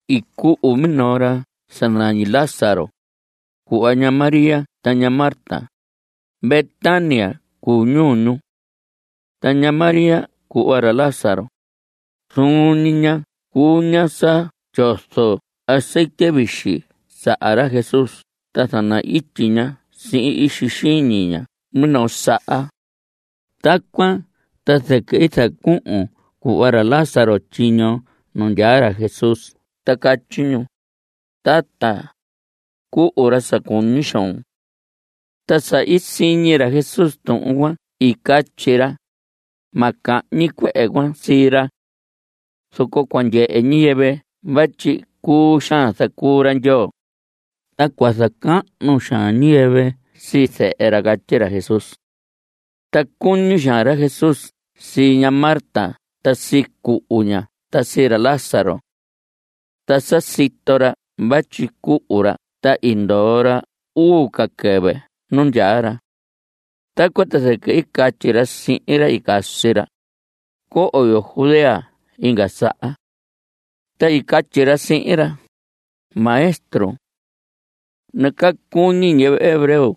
I cuhu minoo ra sa nañi Lázaro, cuhva ña María ta ña Marta. Betania cuu ñuu ñu. Ta ña María cuhva ra Lázaro, zuun ñi ña cuu ña sa tyozo azetye vixi saha ra Jesús ta zana‑ityi ña sihin ixi xiñi ña minoo saha. Tacuan ta zɨquɨ i zacuhun cuhva ra Lázaro tyiño nu ndyaa ra Jesús ta catyi ñu: Tata, cuhu ra sa cuñi xoon. Ta sa i siñi ra Jesús tuhun cuan i catyi ra: Ma cahñi cuehe cuan sii ra. Zoco cua ndyehe ñiyɨvɨ vatyi cuu xaan zacuu ra Ndyoo, ta cua zacahnu xaan ñiyɨvɨ sii Zehe ra. Catyi ra Jesús. Ta cuñi xaan ra Jesús sii ña Marta ta sii cuhu ña ta sii ra Lázaro. Ta sa i sito ra vatyi cuhu ra ta i ndoo ra uu ca quɨvɨ nu ndyaa ra. Tacuan ta zɨquɨ i catyi ra sihin ra i casi ra: Cohon yo Judea inga saha. Ta i catyi ra sihin ra: Maestro, nacaa cuñi ñiyɨvɨ hebreo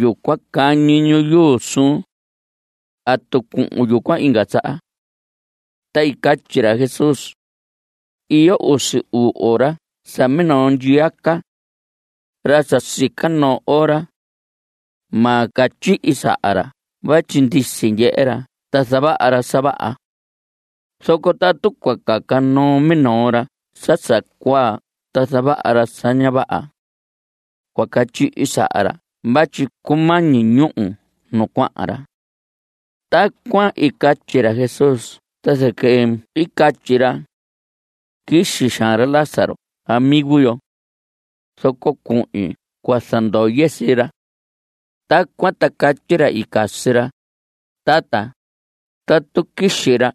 yucuan cañi ñu yuu suun. ¿Atu cuhun yucuan inga saha? Ta i catyi ra Jesús: Iyo usi uu ora sa minoo ndyiyaca. Ra sa sica noo ora, ma catyihi saha ra vatyi ndisi ndyehe ra ta zavaha ra sa vaha. Zoco tatu cua caca noo minoo ra sa sa cuaa ta zavaha ra sa ña vaha, cua catyihi saha ra vatyi cumañi ñúhu nu cuahan ra. Tacuan i catyi ra Jesús ta zɨquɨ i catyi ra: Quixi xaan ra Lázaro amigo yo, zoco cuhin cua zandoye sii ra. Tacuan ta catyi ra i casi ra: Tata, tatu quixi ra,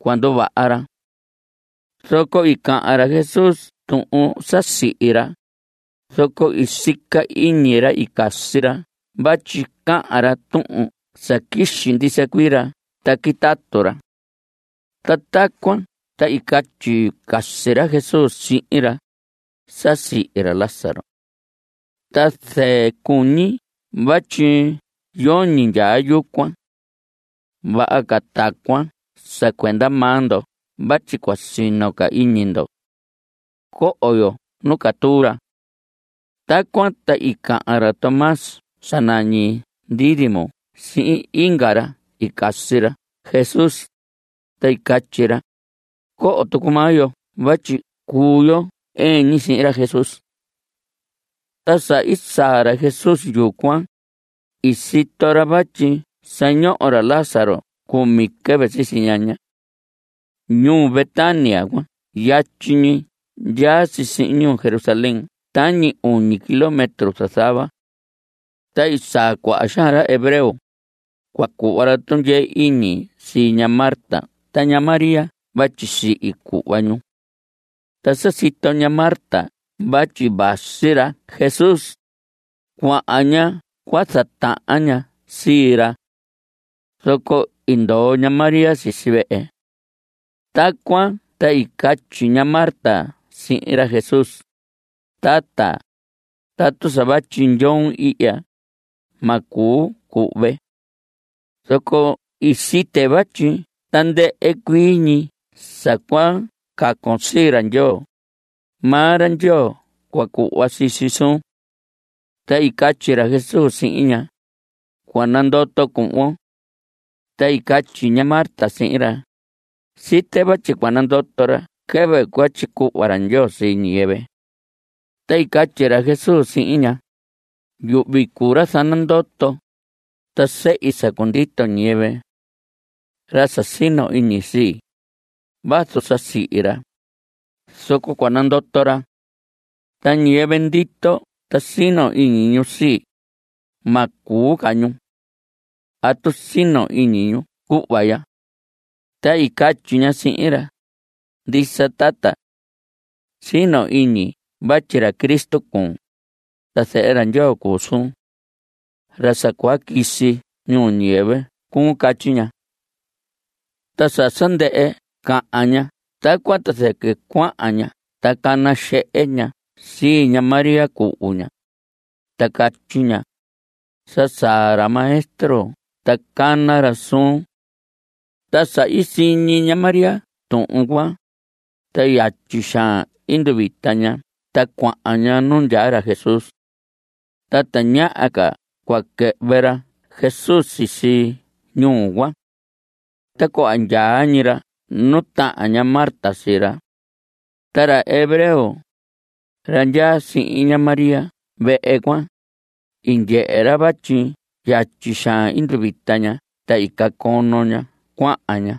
cua nduvaha ra. Zoco i cahan ra Jesús tuhun sa sihi ra, zoco i sica iñi ra i casi ra vatyi cahan ra tuhun sa quixi ndisa cuii ra ta quitatu ra. Ta tacuan ta i catyi casi ra Jesús sihin ra: Sa sihi ra Lázaro. Ta zɨɨ cuñi vatyi yoñi ndyaa yucuan. Vaha ca tacuan sa cuenda maa ndo vatyi cua sino ca iñi ndo. Coho yo nu catuu ra. Tacuan ta i cahan ra Tomás sa nañi Dídimo sihin inga ra i casi ra Jesús, ta i catyi ra: Coho tucu maa yo vatyi cuu yo ɨɨn ñi sihin ra Jesús. Ta sa i saa ra Jesús yucuan, i sito ra vatyi sa ñoho ra Lázaro cumi quɨvɨ sisi ñaña. Ñuu Betania cuan yatyi ñi ndyaa si sihin ñuu Jerusalén tañi uñi kilómetro zazava. Ta i saa cuaha xaan ra hebreo; cua cuhva ra tundyee iñi sii ña Marta ta ña María vatyi sihi cuhva ñu. Ta sa sito ña Marta vatyi vasi ra Jesús, cuahan ña cua zatahan ña sii ra. Zoco i ndoo ña María sisi vehe. Tacuan ta i catyi ña Marta sihin ra Jesús: Tata, tatu sa vatyi ndyoon ihya, ma cuu cuhve. Zoco site vatyi tandɨhɨ cuii ñi sa cua cacon sii ra Ndyoo, maa ra Ndyoo cua cuhva sii si suun. Ta i catyi ra Jesús sihin ña: Cua nandoto cuhvon. Ta i catyi ña Marta sihin ra: Site vatyi cua nandoto ra quɨvɨ cua tyicuhva ra Ndyoo sii ñiyɨvɨ. Ta i catyi ra Jesús sihin ña: Yuhvi cuu ra zanandoto, ta sehi sa cundito ñiyɨvɨ. Ra sa sino iñi sii, vazu sa sihi ra, zoco cua nandoto ra. Ta ñiyɨvɨ ndito ta sino iñi ñu sii, ma cuu ca ñu. ¿Atu sino iñun cuhva ya? Ta i catyi ña sihin ra: Ndisa tata. Sino iñi vatyi ra Cristo cuun, ta Zehe ra Ndyoo cuu suun. Ra sa cua quisi ñuu ñiyɨvɨ cuun. Catyi ña. Ta sa sa ndɨhɨ cahan ña tacuan, ta zɨquɨ cuahan ña ta cana xehe ña sii ña María cuhu ña, ta catyi ña: Sa saa ra Maestro ta cana ra suun. Ta sa i siñi ña María tuhun cuan, ta yatyi xaan i nduvita ña ta cuahan ña nu ndyaa ra Jesús. Ta tañaha ca cua quɨhvɨ ra Jesús sisi ñuu cuan. Ta cuhva ndyaa ñi ra nu tahan ña Marta sii ra. Ta ra hebreo, ra ndyaa sihin ña María vehe cuan, i ndyehe ra vatyi yatyi xaan i nduvita ña ta i cacono ña cuahan ña.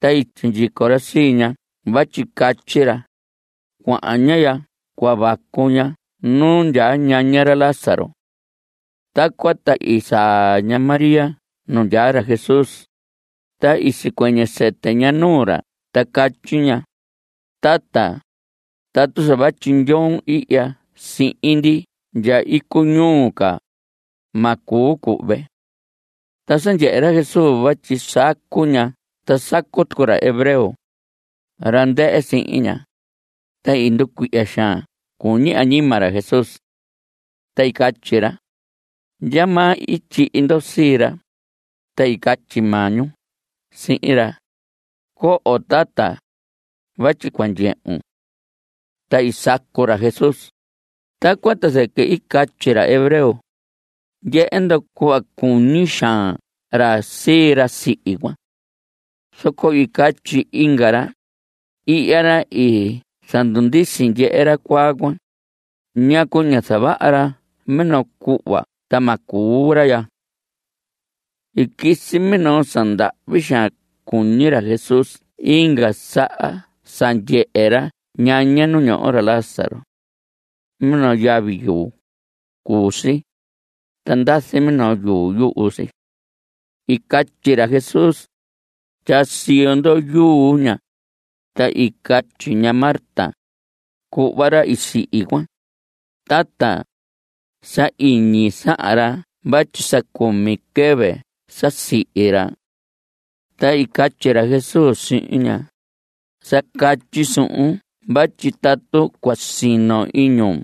Ta i sindyico ra sii ña vatyi catyi ra: Cuahan ña cua vacu ña nu ndyaa ñaña ra Lázaro. Tacuan ta i saa ña María nu ndyaa ra Jesús, ta i sicuɨñɨ sɨtɨ ña nuu ra ta catyi ña: Tata, tatu sa vatyi ndyoon ihya sihin ndi ndya icuñuu ca, ma cuu cuhve. Ta sa ndyehe ra Jesús vatyi sacu ña ta sacu tucu ra hebreo, ra ndɨhɨ sihin ña, ta i nducuihya xaan cuñi añima ra Jesús. Ta i catyi ra: ¿Ndyamaa i tyihi ndo sii ra? Ta i catyi maa ñu sihin ra: Coho, tata, vatyi cua ndyehun. Ta i sacu ra Jesús. Tacuan ta zɨquɨ i catyi ra hebreo: Ndyehe ndo cuhva cuñi xaan ra sii ra sihi cuan. Zoco i catyi inga ra: Ihya ra i zandundisi ndyehe ra cuaa cuan. ¿Ñacu ñá zavaha ra minoo cuhva ta ma cuu ra ya? I quisi minoo sa ndahvi xaan cuñi ra Jesús inga saha sa ndyehe ra ñaña nu ñoho ra Lázaro. Minoo yavi yuu, i cuu si, ta ndazi minoo yuu yuhu si. I catyi ra Jesús: Tyaa siyo ndo yuu ña. Ta i catyi ña Marta, cuhva ra i sihi cuan: Tata, sa iñi sahan ra vatyi sa cumi quɨvɨ sa sihi ra. Ta i catyi ra Jesús sihin ña: Sa catyi suhun vatyi tatu cua sino iñun,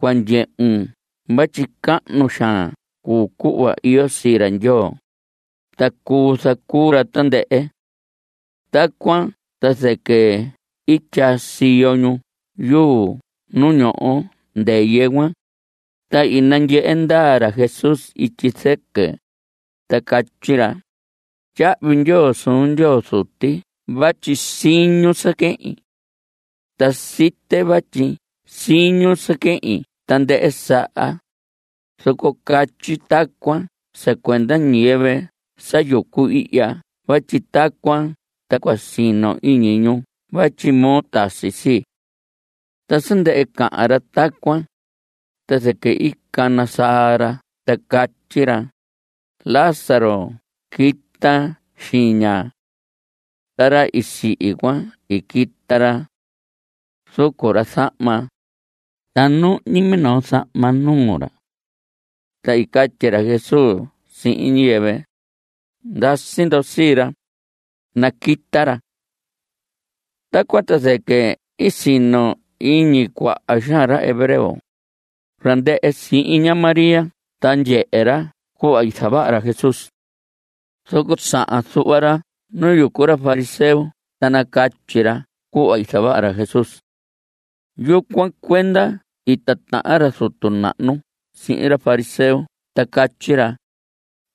cua ndyehun vatyi cahnu xaan cuu cuhva iyo sii ra Ndyoo, ta cuu zacuu ra tandɨhɨ. Tacuan ta zɨquɨ i tyaa siyo ñu yuu nu ñoho ndɨyɨ cuan. Ta i nandyehe ndaa ra Jesús ityi zɨquɨ, ta catyi ra: Tyahvi ndyoo suun Ndyoo Zuti vatyi siñun sa quehin. Ta site vatyi siñun sa quehin tandɨhɨ saha, zoco catyi tacuan sa cuenda ñiyɨvɨ sa yucu ihya vatyi tacuan ta cua sino iñi ñu vatyi moo i tasi sii. Ta sa ndɨhɨ cahan ra tacuan, ta zɨquɨ i cana saa ra ta catyi ra: Lázaro quita xiña. Ta ra i sihi cuan, i quita ra. Zucu ra zahma. Ta nuhñi minoo zahma nuu ra. Ta i catyi ra Jesús sihin ñiyɨvɨ: Ndasi ndo sii ra, naquita ra. Tacuan ta zɨquɨ i sino iñi cuaha xaan ra hebreo, ra ndɨhɨ sihin ña María ta ndyehe ra cuhva i zavaha ra Jesús. Zoco sahan zuhva ra nu yucu ra fariseo ta nacatyi ra cuhva i zavaha ra Jesús. Yucuan cuenda i titahan ra zutu nahnu sihin ra fariseo, ta catyi ra: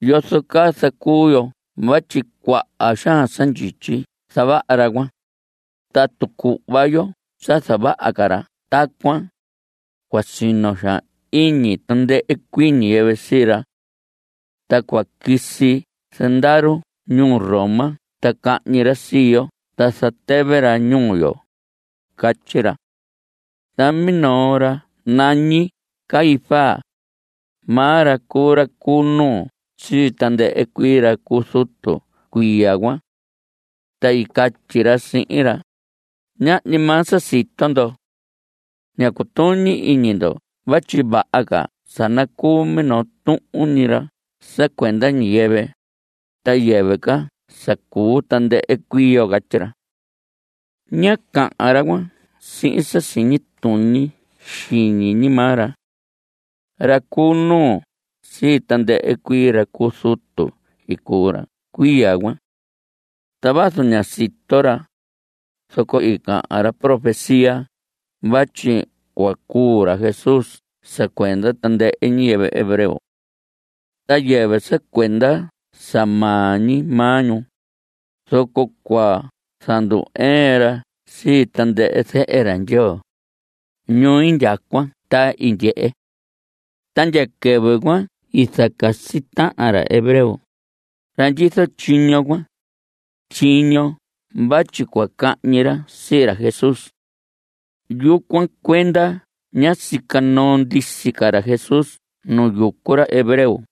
¿Yozo caa zacuu yo vatyi cuaha xaan sa ndyityi zavaha ra cuan? Tatu cuhva yo sa zavaha ca ra tacuan, cua sino xaan iñi tandɨhɨ cuii ñiyɨvɨ sii ra. Ta cua quisi zandaru ñuu Roma ta cahñi ra sii yo ta zatɨvɨ ra ñuu yo. Catyi ra. Ta minoo ra nañi Caifás, maa ra cuu ra cu nuu sii tandɨhɨ cuii ra cu zutu cuiya cuan. Ta i catyi ra sihin ra: Ñahñi maa sa sito ndo. Ña cutuñi iñi ndo vatyi vaha ca sa nacuu minoo tuhun ñi ra sa cuenda ñiyɨvɨ, ta yɨvɨ ca sa cuu tandɨhɨ cuii yo. Catyi ra. Ñá cahan ra cuan sihin sa siñi tuñi xiñi ñi maa ra. Ra cu nuu sii tandɨhɨ cuii ra cu zutu i cuu ra cuiya cuan. Ta vazu ña sito ra, zoco i cahan ra profecía vatyi cua cuu ra Jesús sa cuenda tandɨhɨ ñiyɨvɨ hebreo. Ta yɨvɨ sa cuenda sa maa ñi maa ñu, zoco cua zandu‑ɨɨn ra sii tandɨhɨ zehe ra Ndyoo, ñu indyacuan ta indyehe. Ta ndya quɨvɨ cuan i zacasi tahan ra hebreo, ra ndyizo tyiño cuan, tyiño vatyi cua cahñi ra sii ra Jesús. Yucuan cuenda ñá sica noo ndisi ca ra Jesús nu yucu ra hebreo.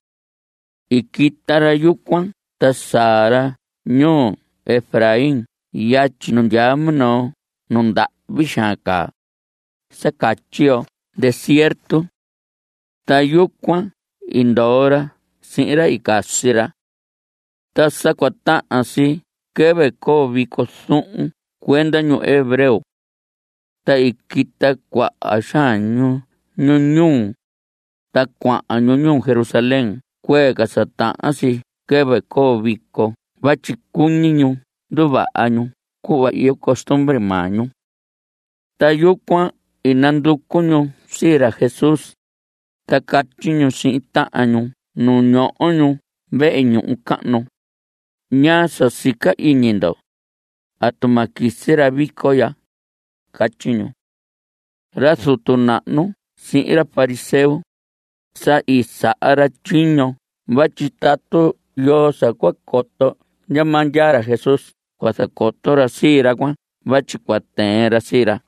I quita ra yucuan ta saa ra ñuu Efraín yatyi nu ndyaa minoo nu ndahvi xaan caa, sa catyi yo desierto. Ta yucuan i ndoo ra sihin ra i casi ra. Ta sa cua tahan si quɨvɨ coo vico zuhun cuenda ñu hebreo. Ta i quita cuaha xaan ñu ñuu ñu, ta cuahan ñu ñuu Jerusalén cuee ca sa tahan si quɨvɨ coo vico vatyi cuñi ñu nduvaha ñu cuhva iyo costumbre maa ñu. Ta yucuan i nanducu ñu sii ra Jesús, ta catyi ñu sihin tahan ñu nu ñoho ñu vehe ñuhu cahnu: ¿Ñaa sa sica iñi ndo? ¿Atu ma quisi ra vico ya? Catyi ñu. Ra zutu nahnu sihin ra fariseo, sa i saha ra tyiño vatyi tatu yoo sa cua coto ndyamaa ndyaa ra Jesús cua zacoto ra sii ra cuan vatyi cua tɨɨn ra sii ra.